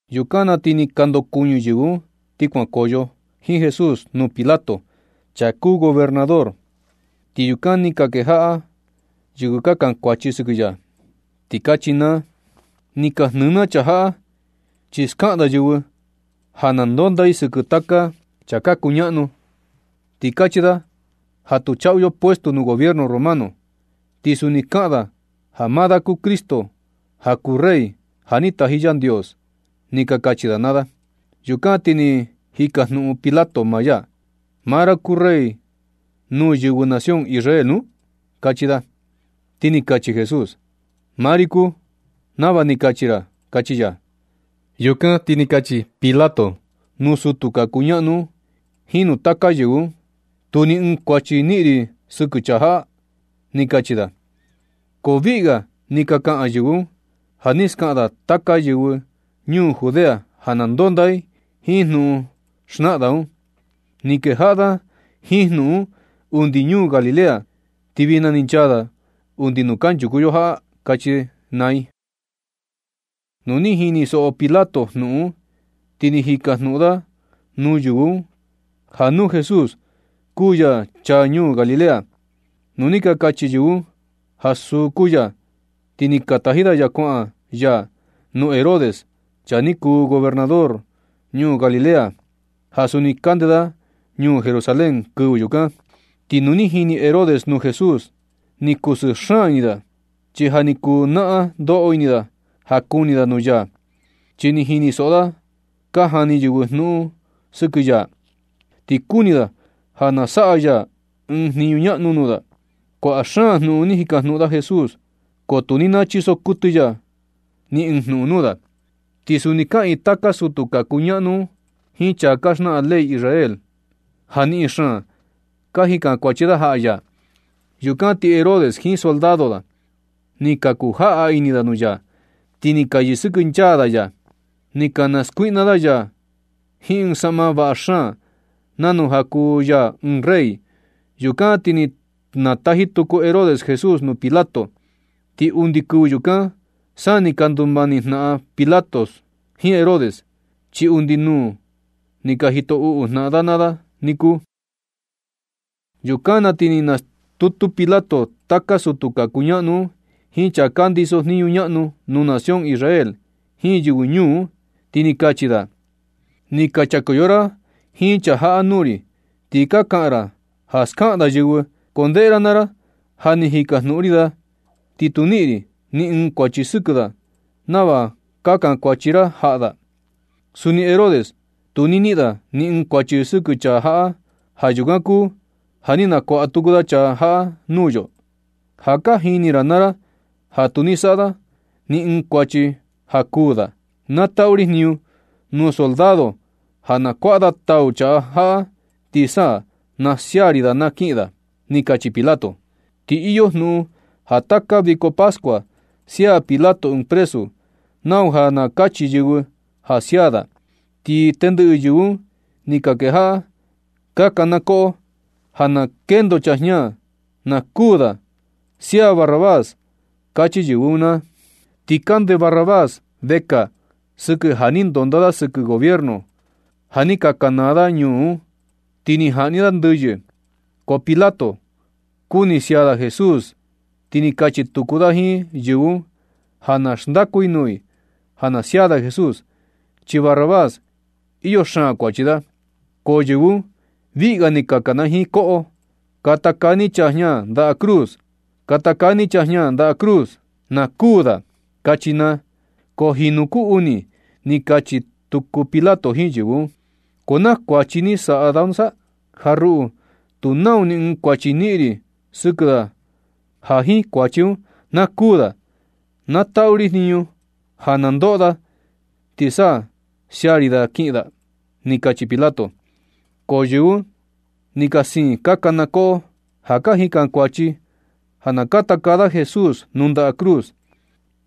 Yukan na ti ni ka ndokuɨñɨ yɨvɨ un ti kuankoyo jiin Jesús nuu Pilato, chaa kuu gobernador. Ti yukan ni ka kejaꞌa yɨvɨ ka kankuachi sɨkɨ ya, ti kachi naa: ―Ni ka jnɨɨ na chaa jaꞌa chi skaꞌan da yɨvɨ ja na ndonda i sɨkɨ taka chaa ka kuñaꞌnu. Ti kachi da ja tu chaꞌu yo puestu nuu gobiernu romano, ti suni kaꞌan da ja maa da kuu Cristo, ja kuu rey ja ni taji Yandios ―ni ka kachi da naa da. Yukan na ti ni jikajnuꞌun Pilato maa ya: ―¿Maa ra kuu rey nuu yɨvɨ nación Israel nu? ―kachi da. Ti ni kachi Jesús: ―Maa ri kuu, nava ni kachi ra ―kachi ya. Yukan ti ni kachi Pilato nuu sutu ka kuñaꞌnu un jiin nuu taka yɨvɨ un: ―Tu ni ɨɨn kuachi niꞌin ri sɨkɨ chaa jaꞌa―ni kachi da. Ko viꞌi ga ni ka kaꞌan yɨvɨ un: ―Ja ni skaꞌan da taka yɨvɨ ñuu Judea ja na ndonda i jiin jnuꞌun xnaꞌan da un. Ni kejaꞌa da jiin jnuꞌun un undi ñuu Galilea, ti vijna ni chaa da undi nuu kanchuku yo jaꞌa―kachi i naa i. Nu ni jinisoꞌo Pilato jnuꞌun un, ti ni jikajnuꞌun da nuu yɨvɨ un ja nu Jesús kuu ya chaa ñuu Galilea. Nu ni ka kachi yɨvɨ un ja suu kuu ya, ti ni taji da ya kuaꞌan ya nuu Herodes, chaa ni kuu gobernador ñuu Galilea, ja suni kande da ñuu Jerusalén kɨvɨ yukan. Ti nu ni jini Herodes nuu Jesús, ni kusɨɨ xaan ini da, chi ja ni kuu naꞌan ndoꞌo ini da ja kuni da nuu ya. Chi ni jinisoꞌo da ka jani yɨvɨ jnuꞌun sɨkɨ ya, ti kuni da ja na saꞌa ya ɨɨn jniñu ñaꞌnu nuu da. Kuaꞌa xaan jnuꞌun ni jikajnuꞌun da Jesús, ko tu ni nachiso kuɨtɨ ya ni ɨɨn jnuꞌun nuu da. Ti suni kaꞌiin taka sutu ka kuñaꞌnu un jiin chaa ka xnaꞌan ley Israel un, ja niꞌin xaan ka jikan kuachi da jaꞌa ya. Yukan ti Herodes jiin soldado da, ni ka ku jaꞌa ini da nuu ya, ti ni ka yɨsɨkɨnchaa da ya. Ni ka naskuiꞌna da ya jiin ɨɨn saꞌma vaꞌa xaan, nanu ja kuu ya ɨɨn rey. Yukan ti ni nataji tuku Herodes Jesús nuu Pilato. Ti undi kɨvɨ yukan sa ni ka ndumani jnaꞌan Pilato jiin Herodes, chi undi nuu ni ka jito uꞌu jnaꞌan da naa da niku. Yukan na ti ni nastutu Pilato taka sutu ka kuñaꞌnu un, jiin chaa ka ndiso jniñu ñaꞌnu nuu nación Israel, jiin yɨvɨ ñuu un, ti ni kachi da: ―Ni ka chakoyo ra jiin chaa jaꞌa nuu ri. Ti ka kaꞌan ra ja skaꞌan da yɨvɨ. Ko ndeꞌe ra naa ra ja ni jikajnuꞌun ri da, ti tu niꞌin ri ni ɨɨn kuachi sɨkɨ da nava ka chakuachi ra jaꞌa da. Suni Herodes tu ni niꞌin da ni ɨɨn kuachi sɨkɨ chaa jaꞌa. Ja yukan kuu ja ni nakuaꞌa tuku da chaa jaꞌa nuu yo. Ja ka jini ra naa ra ja tu ni saꞌa da ni ɨɨn kuachi ja kuū da. Na taꞌu ri jniñu nuu soldado ja na kuaꞌa da tau chaa jaꞌa, ti sa na sia ri da kiꞌin da ―ni kachi Pilato. Ti iyo jnuꞌun ja taka viko pascua sia Pilato ɨɨn presu, nau ja na kachi yɨvɨ ja sia da. Ko tendɨꞌɨ yɨvɨ un ni ka kejaꞌa ka kanakoꞌo: ―¡Na kendo chaa jña na kuū da! ¡Sia Barrabás! ―kachi yɨvɨ un naa. Ti kande Barrabás vekaa sɨkɨ, ja ni ndonda da sɨkɨ gobierno ja ni ka kanaa da ñuu un, ti ni jaꞌni da ndɨyɨ. Ko Pilato, kuni sia da Jesús, ti ni kachi tuku da jiin yɨvɨ un ja na xndaku da nuu i ja na sia da Jesús, chi Barrabás iyo xaan kuachi da. Ko yɨvɨ un viꞌi ga ni ka kanajiin koꞌo: ―¡Katakaa ni chaa jña ndaꞌa cruz! ¡Katakaa ni chaa jña ndaꞌa cruz, na kuū da! ―kachi naa. Ko jinu ku uni ni kachi tuku Pilato jiin yɨvɨ un: ―¿Ko naa kuachi ni saꞌa da nusa? Ja ruꞌu tu nau ni ɨɨn kuachi niꞌin ri sɨkɨ da ja jiin kuachi un na kuū da. Na taꞌu ri jniñu ja na ndoꞌo da ti sa na sia ri da na kiꞌin da ―ni kachi Pilato. Ko yɨvɨ un ni ka siin ka kanakoꞌo, ja ka jikankuachi ja na katakaa da Jesús nuu ndaꞌa cruz.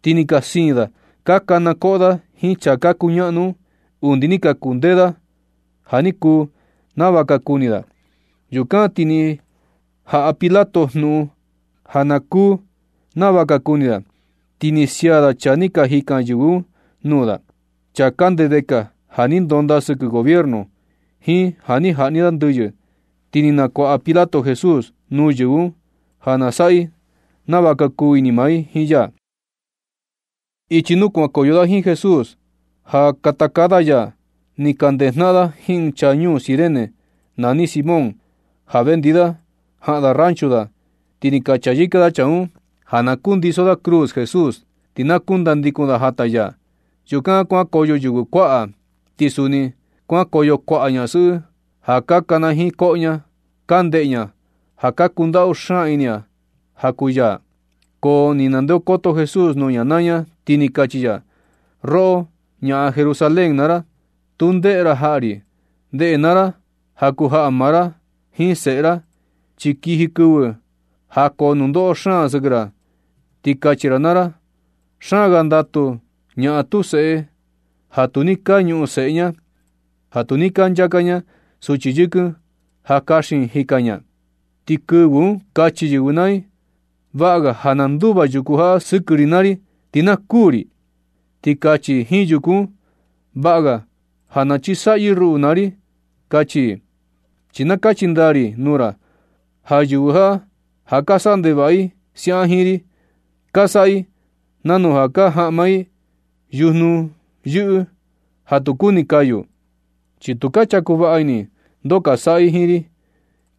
Ti ni ka siin da ka kanakoꞌo da jiin chaa ka kuñaꞌnu un, undi ni ka kundee da ja ni kuu nava ka kuni da. Yukan ti ni jaꞌa Pilato jnuꞌun ja na kuu nava ka kuni da. Ti ni sia da chaa ni ka jikan yɨvɨ un nuu da, chaa kande vekaa ja ni ndonda da sɨkɨ gobierno, jiin ja ni jaꞌni da ndɨyɨ. Ti ni nakuaꞌa Pilato Jesús nuu yɨvɨ un, ja na saꞌa i nava ka kuu ini maa i jiin ya. Ichi nuu kuankoyo da jiin Jesús ja katakaa da ya, ni ka ndejnaꞌan da jiin ɨɨn chaa ñuu Cirene nani Simón, ja vendi da ni jaꞌan da ranchu da. Ti ni ka chayɨka da chaa un ja na kundiso da cruz Jesús, ti na kundandikun da jata ya. Yukan kuankoyo yɨvɨ kuaꞌa. Ti suni kuankoyo kuaꞌa ñasɨꞌɨ ja ka kanajiin koꞌo ña, ka ndeꞌe ña, ja ka kundaꞌu xaan ini ña ja kuu ya. Ko ni nandeokoto Jesús nuu ña naa ña, ti ni kachi ya: ―Roꞌo, ñaꞌan Jerusalén naa ra, tu ndeꞌe ra jaꞌa ri. Ndeꞌe naa ra ja kuu jaꞌa maa ra jiin seꞌe ra, chi kiji kɨvɨ ja koo nundoꞌo xaan sɨkɨ ra, ti kachi ra naa ra: “Xaan ga ndatu ñaꞌan tu seꞌe, ja tu ni ka ñuꞌun seꞌe ña, ja tu ni ka nchaka ña suchi yɨkɨn ja kaxin i jika ña.” Ti kɨvɨ un kachi yɨvɨ naa i: “Vaꞌa ga ja na nduva yuku jaꞌa sɨkɨ ri naa ri, ti na kuū ri.” Ti kachi i jiin yuku un: “Vaꞌa ga ja chisaꞌyɨ ruꞌu naa ri”, kachi i. Chi na kachi ndaa ri nuu ra ja yɨvɨ jaꞌa, ja ka saꞌa ndevaꞌa i siaꞌan jiin ri, ka saꞌa i nanu ja ka jaꞌma i yujnu yɨꞌɨ ja tu kuni kayu, chi tu chaku vaꞌa ini i ndoo ka saꞌa i jiin ri.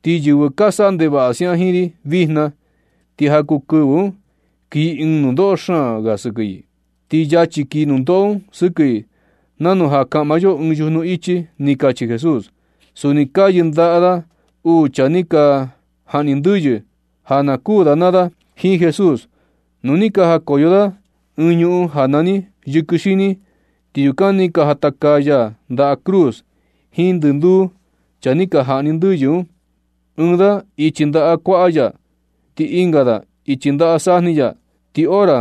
Ti yɨvɨ ka saꞌa ndevaꞌa siaꞌan jiin ri vijna, ti ja kuu kɨvɨ un kii ɨɨn nundoꞌo xaan ga sɨkɨ i. Ti yachi kii nundoꞌo un sɨkɨ i nanu ja nu kaꞌma yo ɨɨn yujnu ichi ―ni kachi Jesús. Suni ka yɨndaꞌa da uu chaa ni ka jaꞌni ndɨyɨ, ja na kuu da naa da jiin Jesús. Ti nu ni ka jakoyo da ɨɨn ñuꞌun ja nani “yɨkɨ xini”, ti yukan ni ka jatakaa da ya nda cruz jiin ndɨnduu chaa ni ka jaꞌni ndɨyɨ un, ɨɨn da ichi ndaꞌa kuaꞌa ya, ti ɨnga da ichi ndaꞌa sajni ya. Ti hora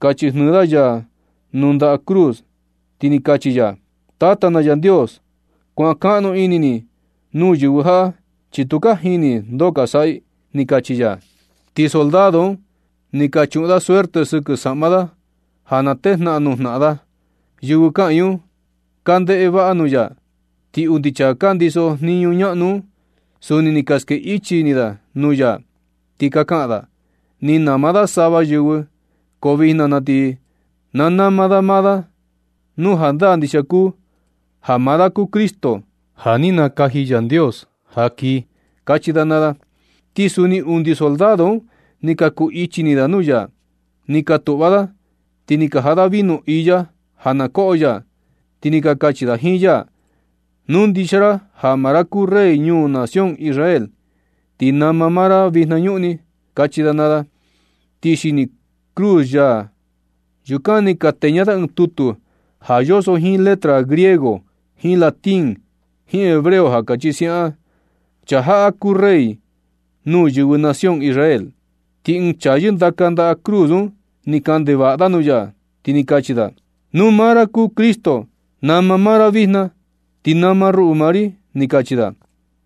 ka chijnɨɨ da ya nuu ndaꞌa cruz, ti ni kachi ya: ―Tata na Yandios, kuankaꞌnu ini ni nuu yɨvɨ jaꞌa, chi tu ka jini i ndoo ka saꞌa i ―ni kachi ya. Ti soldado un ni ka chuꞌun da suerte sɨkɨ saꞌma Jesús, ja na tejnaꞌan nuu jnaꞌan da. Yɨvɨ kaꞌiin un ka ndeꞌe vaꞌa nuu ya, ti undi chaa ka ndiso jniñu ñaꞌnu un, suni ni ka ske ichi ini da nuu ya, ti ka kaꞌan da: ―Ni nama da sava yɨvɨ, ko vijna na ti na nama da maa da nu jandaa ndixia kuu ja maa da kuu Cristo, ja ni nakaji Yandios ja kii ―kachi da naa da. Ti suni undi soldado un ni ka kuu ichi ini da nuu ya. Ni ka tuꞌva da, ti ni ka jaꞌa da vino iya ja na koꞌo ya, ti ni ka kachi da jiin ya: ―Nu ndixia ra ja maa ra kuu rey nuu nación Israel, ti nama maa ra vijna ñuꞌni ―kachi da naa da. Ti xini cruz ya yukan ni ka teña da ɨɨn tutu ja yoso jiin letra griego, jiin latín, jiin hebreo, ja kachi siaꞌan: “Chaa jaꞌa kuu Rey nuu yɨvɨ nación Israel.” Ti ɨɨn chaa yɨndaka ndaꞌa cruz un ni kaꞌan ndevaꞌa da nuu ya, ti kachi da: ―Nu maa ra kuu Cristo, nama maa ra vijna, ti nama ruꞌu naa ri ―ni kachi da.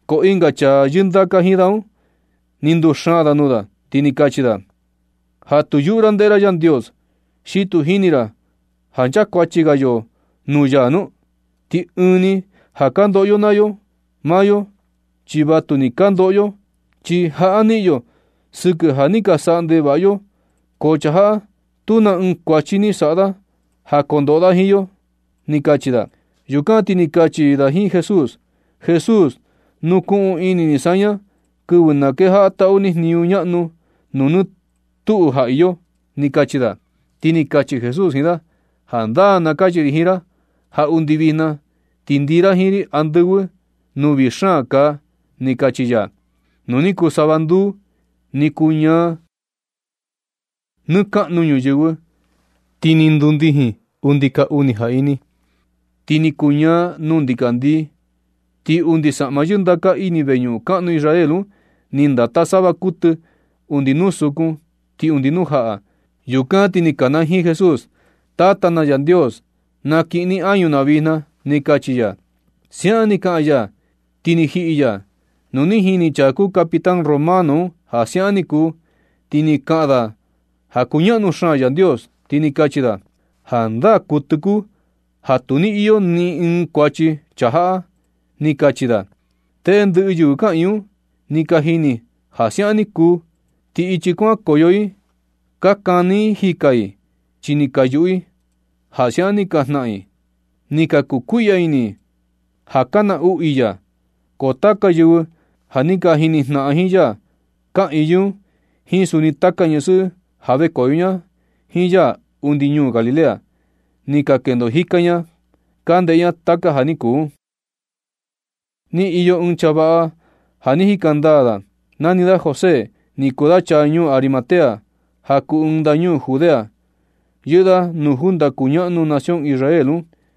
Ko ɨnga chaa yɨndaka jiin da un, ni nduxaan da nuu da, ti ni kachi da: ―Ja tu yuꞌu ra ndeꞌe ra Yandios. ¿Xi tu jini ra ja kunchakuachi ga yo nuu ya nu? Ti ɨɨn ni ja ka ndoꞌo yo naa yo. Maa yo chi vatu ni ka ndoꞌo yo, chi jaꞌa niꞌin yo sɨkɨ ja ni ka saꞌa ndevaꞌa yo. Ko chaa jaꞌa, tu na ɨɨn kuachi ni saꞌa da ja kondoꞌo da jiin yo ―ni kachi da. Yukan ti ni kachi da jiin Jesús: ―Jesús, nukuꞌun ini ni saña kɨvɨ na kejaꞌa taꞌu ni jniñu ñaꞌnu nuu nɨ tuꞌu ja iyo ―ni kachi da. Ti ni kachi Jesús jiin da: ―Jandaa na kachi ri jiin ra ja undi vijna ti ndii ra jiin ri andɨvɨ, nuu vii xaan kaa ―ni kachi ya. Nu ni kuu sava nduu, ni kuñaa nɨ kaꞌnu ñuyɨvɨ, ti ni ndundijin undi ka uni jaꞌini. Ti ni kuñaa nuu ndikandii. Ti undi saꞌma yɨndaka ini veñuꞌun kaꞌnu Israel un, ni ndata sava kuɨtɨ undi nuu sukun ti undi nuu jaꞌa. Yukan ti ni kanajiin Jesús: ―Tata na Yandios, na kiꞌin ni añu na vijna ―ni kachi ya. Siaꞌan ni kaꞌan ya, ti ni jiꞌi ya. Nu ni jini chaa kuu capitán romano un ja siaꞌan ni kuu, ti ni kaꞌan da ja kuñaꞌnu xaan Yandios, ti ni kachi da: ―Jandaa kuɨtɨ kuu ja tu ni iyo ni ɨɨn kuachi chaa jaꞌa―ni kachi da. Tendɨꞌɨ yɨvɨ kaꞌiin un, ni ka jini ja siaꞌan ni kuu. Ti ichi kuankoyo i, ka kani i jikɨ jika i, chi ni ka yuꞌu i ja siaꞌan ni ka janhan i un. Ni ka kuu kuiꞌya ini i ja ka naꞌnu i ya. Ko taka yɨvɨ ja ni ka jini jnaꞌan jiin ya, kaꞌiin yɨ un jiin suni taka ñasɨꞌɨ ja vekoyo ña jiin ya undi ñuu Galilea. Ni ka kendo jika ña ka ndeꞌe ña taka ja ni kuu un. Ni iyo ɨɨn chaa vaꞌa, ja ni jika ndaa da, nani da José, ni kuu da chaa ñuu Arimatea, ja kuu ɨɨn ndañuu Judea. Yɨꞌɨ da nuu junta kuñaꞌnu nación Israel un.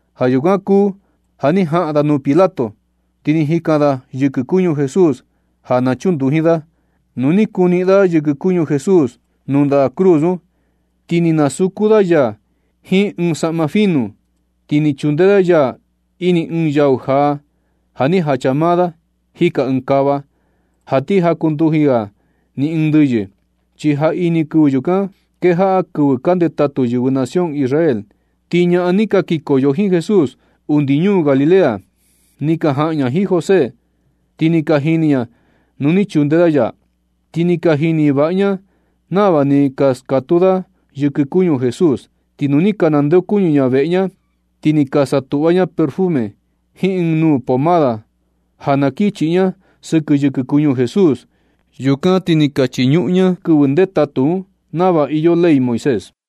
Ja yukan kuu ja ni jaꞌan da nuu Pilato, ti ni jikan da yɨkɨ kuñu Jesús ja na chunduji da. Nu ni kuniꞌin da yɨkɨ kuñu Jesús nuu ndaꞌa cruz un, ti ni nasuku da ya jiin ɨɨn saꞌma finu. Ti ni chunde da ya ini ɨɨn yau jaa, ja ni jacha maa da jika ɨɨn kava, ja ti jakunduji ga ni ɨɨn ndɨyɨ. Chi jaꞌini kɨvɨ yukan kejaꞌa kɨvɨ ka ndetatu yɨvɨ nación Israel. Ti ñaꞌan ni ka kikoyo jiin Jesús undi ñuu Galilea, ni ka jaꞌan ña jiin José, ti ni ka jini ña nuu ni chunde da ya, ti ni ka jini vaꞌa ña nava ni ka skatuu da yɨkɨ kuñu Jesús. Ti nu ni ka nandeokuñɨ ña veꞌe ña, ti ni ka satuꞌva ña perfume, jiin ɨɨn nuu pomada ja na kin chiꞌi ña sɨkɨ yɨkɨ kuñu Jesús. Yukan ti ni ka chiñuꞌun ña kɨvɨ ndetatu un nava iyo ley Moisés.